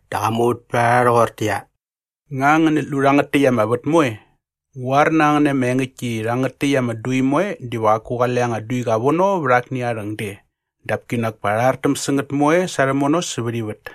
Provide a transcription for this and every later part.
Dä qa muvät pät a rha rhoqortäqyia, “Nga ngänät lu rhangät täkt ama vät moe? Ngu qoar na ngän na ama engäktki i rhangät täkt ama dui moe diva qaku qale anga duiqa vono vät akni aa rhäng de dap kinak pa rha rhartäm sä ngät moe sa rhämono sävät ivät.”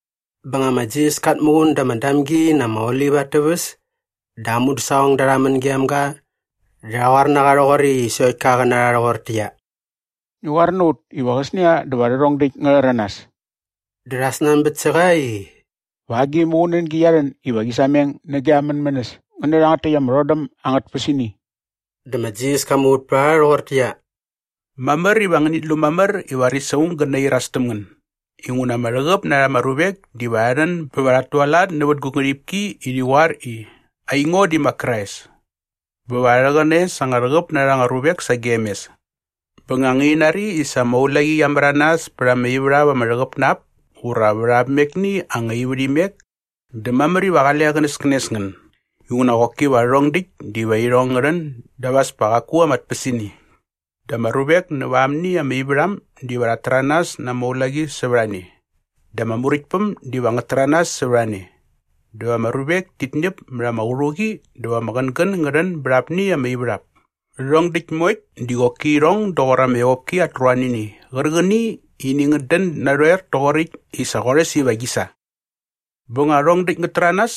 Bä nga ma Jisas kat muqun da ama Damgi na ama Olip at täväs dä aa mudäsaqongda rha män gem ga dä rha qoar na qa rhoqoräkt i sokt ka qä na rha rhoqortäqyia, “Ngi qoar na ut iva qäsnia dä va rhärhong däkt ngä rhäranas.” Dä rha snanbät sä qa i, “Va agi muqunängi qia rhän iva qi sameng nä gia mänmänäs ngä nä rhangät täkt ama rhodäm angät tpäsini?” Dä ma Jisas ka muvät pät a rha rhoqortäqyia, “Mamär iva ngänit lu mamär i varis aung gä nairas täm ngän. Inguna ama rhäqäp na rha ama ruvek diva rha rhän bä va rhat tualat nävät gu ngärhipki i rhi qoar i, ‘Aingo di ma Krais!’ Bä va rha rhäqäne sa anga rhäqäp na rha anga ruvek sagem mes. “Bä nga ngäni nari i sa ama ulaqi qia märanas pät ama ivärhap ama rhäqäp na ap ura vät amekni anga ivärhimek dä mamär iva qale qänäskänes ngän inguna qoki va rhärhong däkt diva irhong ngä rhän dap as pa qaku ama tpäsini. Dä ama ruvek näva amni ama ivärham diva rhat täranas na ama ulaqi sävät a ne dä ama muräktpäm diva ngät täranas sävät a ne dä va ama ruvek tit ñäp mät ama qärhuqi dä va ama qängän ngä rhän bät apni ama ivärhap. Rhärhong däkt moekt di qoki irhong doqor ama evopki at ruanini qärqäni i ini ngät dän narhoer toqoräkt i sa qorhäs iva qi sa. “Bä nga rhärhong däkt ngät täranas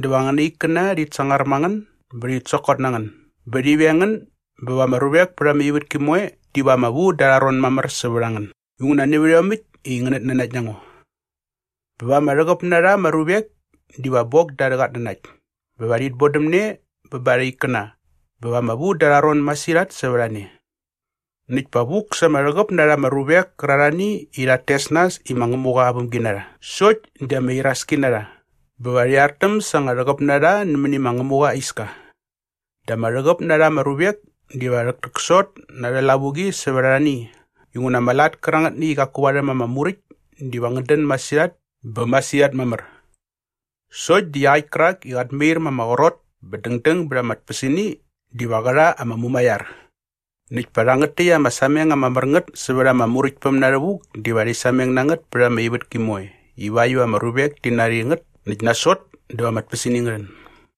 dä va angäna ikkäna rhit sangar ma ngän bä rhit sokot na ngän bä rhi veng ngän bä va ama ruvek pät ama ivätki moe diva ama vu da arha ron mamär sävät a ngän inguna nävät iomäkt i ngänät nanakt na ngo. Bä va ama rhäqäp na rha ama ruvek diva bok da arhä qatnanakt bä va rhit bodäm ne bä ba arha ikkäna bä va ama vu da arha ron masirhat sävät a ne. Näkt pa vuk sa ama rhäqäp na rha ama ruvek kärarhani i rhat tes nas i ma Ngämuqa aa vämginarha sokt di ama iraski na rha bä va rhi artäm sa anga rhäqäp na rha nämäni ma Ngämuqa aa iska. Dä ama rhäqäp na rha ama ruvek diva rhäktäksot na arhä lavuqi sävät arhani inguna ama lat kärangätni i qaku varhäm ama Muräkt diva ngät dän masirhat bä masirhat mamär. Sokt di iaqäkt kärak i qat mair ma ama qrot bä dängdäng bät ama tpäsini diva qä rha ama mumaiar. Näkt pa rhangät täkt ama sameng ama mär ngät sävät ama Muräktpäm na rhävuk diva rhi sameng na ngät pät ama ivätki moe ivakt iva ama ruvek ti nari ngät näkt nasot dä va ama tpäsini ngä rhän.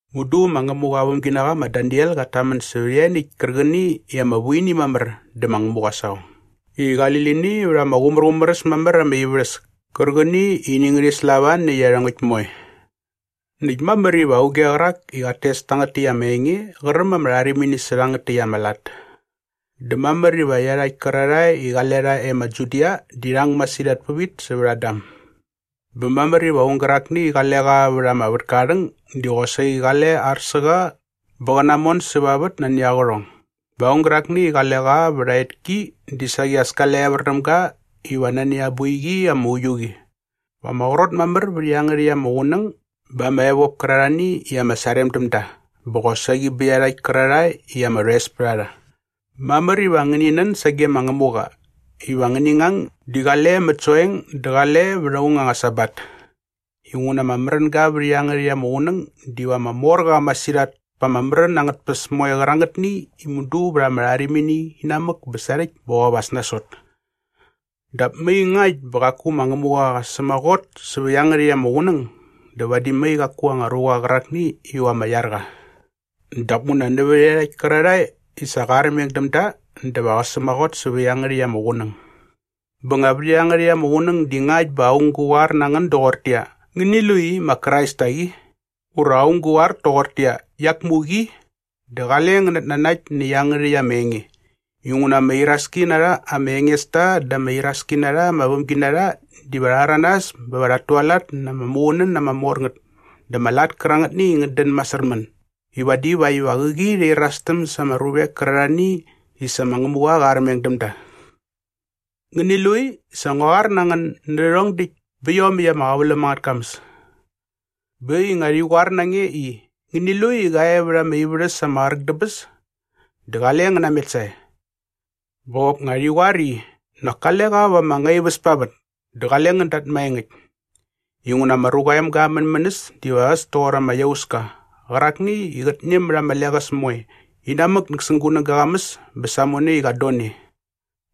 “Mudu ma Ngämuqa aa vämginaqa ma Daniel qat tamän sävät ianiäkt kärqäni i ama vu ini mamär dä ma Ngämuqa aa saqong i qali lini vät ama qumärqumär äs mamär ama ivärhäs kärqäni i ini ngärhi slava nä iarhongäkt moe. Näkt mamär iva auge qärak i qat tes tangät täkt ama enge qä räm ama rharimini sä iangärhäkt ama lat. Dä mamär iva iarhakt kärarhae i qale rha e ma Judia di rhi ang masirhat pävit sävät ama dam. Bä mamär iva aung gärakni i qale qa vät ama vätka aa rhäng di saqi as kale ar sä qa bä qä namon säva vät nani aa qärhong. Bä aung gärakni i qale qa vät aa etki di saqi as kale evär däm ga iva nani aa boiqi ama uiu qi. Va ama qrot mamär vät iangärhäkt ama qunäng ba ama evop kärarhani i ama sarem däm da bä qosaqi bä iarhakt kärarhae i ama rhoes pät a rha. Mamär iva ngäni nän sage ma Ngämuqa iva ngäni ngang di qale mät soeng dä qale vät aung anga Sabat. Inguna ama märänga vät iangärhäkt ama qunäng diva ama mor qa masirhat pä ama märän angät tpäs moe qärangätni i mudu vät ama rharimini inamäk bä sarhäkt bä qop as nasot. Dap mai ngakt bä qaku ma Ngämuqa qa sämaqot sävä iangärhäkt ama qunäng dä vadi mai qaku anga ruqa qärakni iva ama iar qa. Dap nguna nävät iarhakt kärarhae i sa qa armeng däm da dä va qä sämaqot sävä iangärhäkt ama qunäng. “Bä nga vät iangärhäkt ama qunäng di ngakt bä aung gä qoar na ngän doqortäqyia, ‘Ngäni lu i ma Krais tak i!’ ura aung gä qoar toqortäqyia, ‘Iak muk i!’ dä qale ngän natnanakt nä iangärhäkt ama enge. Inguna ama iraski na rha ama engesta dä ama iraski na rha ama vämginarha diva rha rhäranas bä va rhat tualat na ama muqunän ama mor ngät dä ama lat kärangätni i ngät dän masärmän i vadi vakt iva qäqi rhi irastäm sa ama ruvek kärarhani i sa ma Ngämuqa qa armeng däm da. Ngäni lu i sa ngua qoar na ngän nä rhärhong däkt bä iomäkt ama qäväläm angät kamäs. Bä äkt i nga rhi qoar na nge i, ‘Ngäni lu i qa e vät ama ivärhäs ama qräk dä bäs’ dä qale ngän namet sae. Bä qop nga rhi qoar i, ‘Nak kale qa va ama ngaiväs pa vät’ dä qale ngän dat maengäkt. Inguna ma Ruqa aa Emga aa mänmänäs diva äs toqor ama iauska qärakni i qät ñäm mät ama leqäs moe inamäk näsäng gunäga aa qamäs bä samone i qat don e.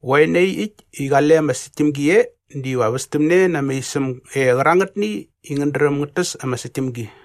Qoe nai äkt i qale ama säktämgi e diva västämne na ama isäm e qärangätni i ngät dräm ngät täs ama säktämgi.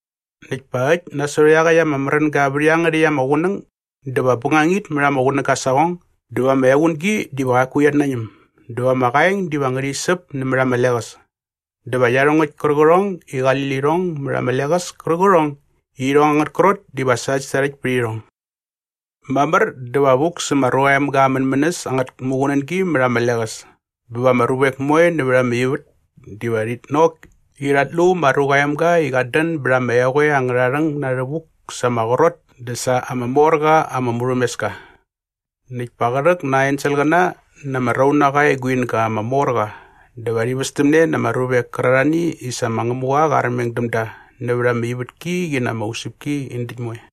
“Näkt pa äkt nasot iaqäkt ama märänga vät iangärhäkt ama qunäng dä va bängangit mät ama qunäga aa saqong dä va ama equngi diva qaku qiat nañäm dä va ama qaeng diva ngärhi säp nämät ama leqäs dä va iarhongäkt kärqärhongni i qali lirhong mät ama leqäs kärqärhongni i irhong angät krot diva sarhäktsarhäkt pät irhong. “Mamär dä va vuk sä ma Ruqa aa Emga aa mänmänäs angät muqunängi mät ama leqäs bä va ama ruvek moe nävät ivät diva rhit nok i rhat lu ma Ruqa aa Emga i qat dän bät ama eqoe angärha rhäng na rhävuk sa ama qrot dä sa ama mor qa ama murhämeska. Näkt pa qä rhäk na aa enselqäna na ama raunaqa aa eguinga ama mor qa dä va rhi västämne na ama ruvek kärarhani i sa ma Ngämuqa qa armeng däm da nävät ama ivätki qi na ama usäpki in däkt moe.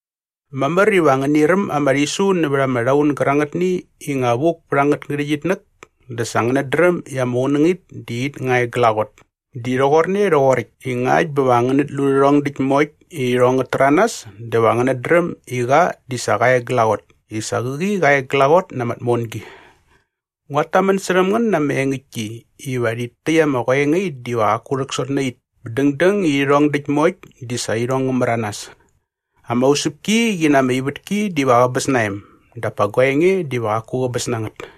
“Mamär iva ngäni räm ama rhisu nävät ama rhaun gärangätni i nga vuk pät angät ngärhäqyitnäk dä sa ngänät dräm i ama qunängit di it nga e glaqot. Di rhoqorne rhoqoräkt i ngakt bä va ngänät lu rhärhong däkt moekt i irhong ngät täranas dä va ngänät dräm i qa di sa qa e glaqot i sa qäqi qa e glaqot na ama tmongi. Nguat tamän särhäm ngän na ama engäktki iva rhit täkt ama qoengait diva qaku rhäksot nä it bä dängdäng i rhärhong däkt moe di sa irhong ngä märanas. Ama usäpki qi na ama ivätki diva qäbäs na em dap pa gua enge diva qaku qäbäs na ngät.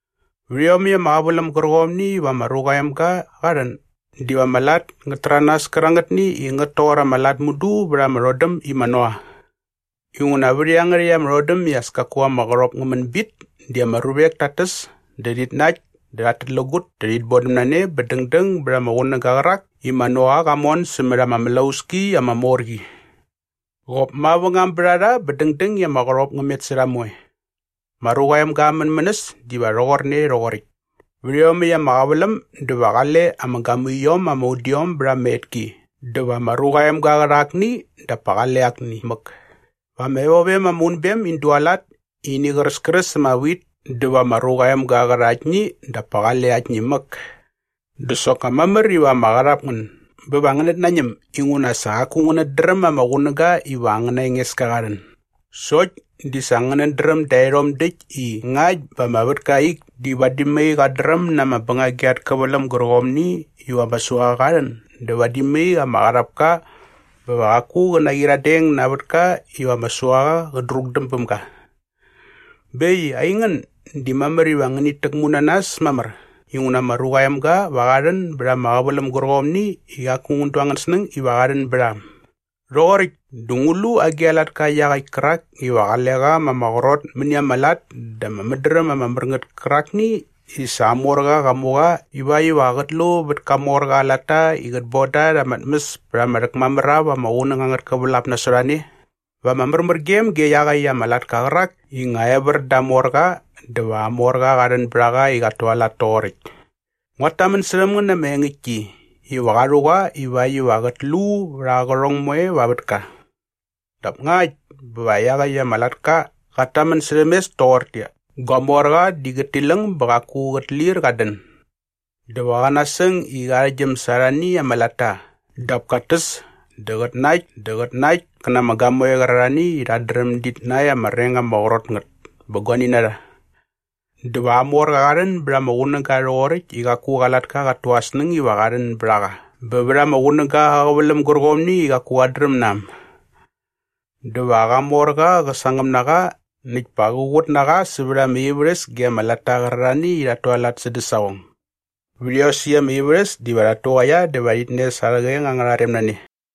Vät iomäkt ama qäväläm gärqomni iva ma Ruqa aa Emga qa rhän diva ama lat ngät täranas kärangätni i ngät toqor ama lat mudu vät ama rhodäm i ma Noa. Inguna vät iangärhäkt ama rhodäm i as kaku ama qärhop ngä män bit di ama ruvek tat täs dä rhit nakt dä rhat tätlägut dä rhit bodäm na ne bä dängdäng bät ama qunäga qärak i ma Noa qa mon sämät ama mlauski ama mor qi. Qop mavängam bät a rha bä dängdäng i ama qärhop ngä met sä rha moe. Ma Ruqa aa Emga aa mänmänäs diva rhoqorne rhoqoräkt. “Vät iomäkt ama qäväläm dä va qale ama gamuiom ama udiom bät ama etki dä va ma Ruqa aa Emga qa rha akni dap pa qale akni mäk. Va ama evovem ama unbem in dualat i ini qräskräs ama wit dä va ma Ruqa aa Emga qä rha aktni dap pa qale aktni mäk. Dä soknga mamär iva ama qarhap ngän bä va ngänät nañäm inguna sa qaku ngänät dräm ama qunäga iva angäna Engeska qa rhän. Sokt di sa ngänät dräm daerhom däkt i ngakt bä ama vätka aa ik di vadi mai qat dräm na ama bängagi at käväläm gärqomni iva ama suaqa qa rhän dä vadi mai ama qarhap ka bä va qaku qä naqyiradeng na aa vätka iva ama suaqa qä drukdäm bäm ga. Bä äkt i aingän di mamär iva ngänit täkmu na nas mamär inguna ma Ruqa aa Emga va qa rhän bät ama qäväläm gärqomni i qaku ngän du angän snäng iva qa rhän bät a äm. “Rhoqoräkt dä ngu lu agi a latka iaqäkt kärak iva qale qa ma ama qrot mäni ama lat dä aa mädräm ama mär ngät kärakni i sa aa morqa qa mu qa ivakt iva qät lu vät ka morqa aa latta i qät boda rha arha tmäs pät ama rhäkmamär ap ama qunäng angät kävälap nasot a ne? Va ama märmärgem ge iaqäkt ama latka qärak i nga evär da aa morqa dä va aa morqa qa rhän bät a qa i qat tualat toqoräkt. Nguat tamän särhäm ngän na ama engäktki iva qa rhu qa ivakt iva qät lu vät aa qärhong moe va aa vätka. Dap ngakt bä va iaqäkt ama latka qat tamän särhäm mes doqortäqyia, ‘Gua morqa di qät tiläng bä qaku qät lir qat dän’ dä va qä nasäng i qä arhäktgyäm sa arhani ama latta dap kat täs dä qät nakt dä qät nakt kä na ama gamoe qärarhani i rhat dräm dit näkt ama reng ama qrot ngät bä guani na rha dä va aa morqa qa rhän bät ama qunäga rhoqoräkt i qaku qa latka qat tu aa snäng iva qa rhän bät a qa bä vät ama qunäga aa qäväläm gärqomni i qaku qat dräm na äm. Dä va qa morqa qä sangäm na qa näkt pa qä qut na qa sävät ama ivärhäs ge ama latta qärarhani i rhat tualat sädä saqong. Vät iosäkt ama ivärhäs diva rhat tuqaia dä va rhit nes arhä qeng angärha rem na ne.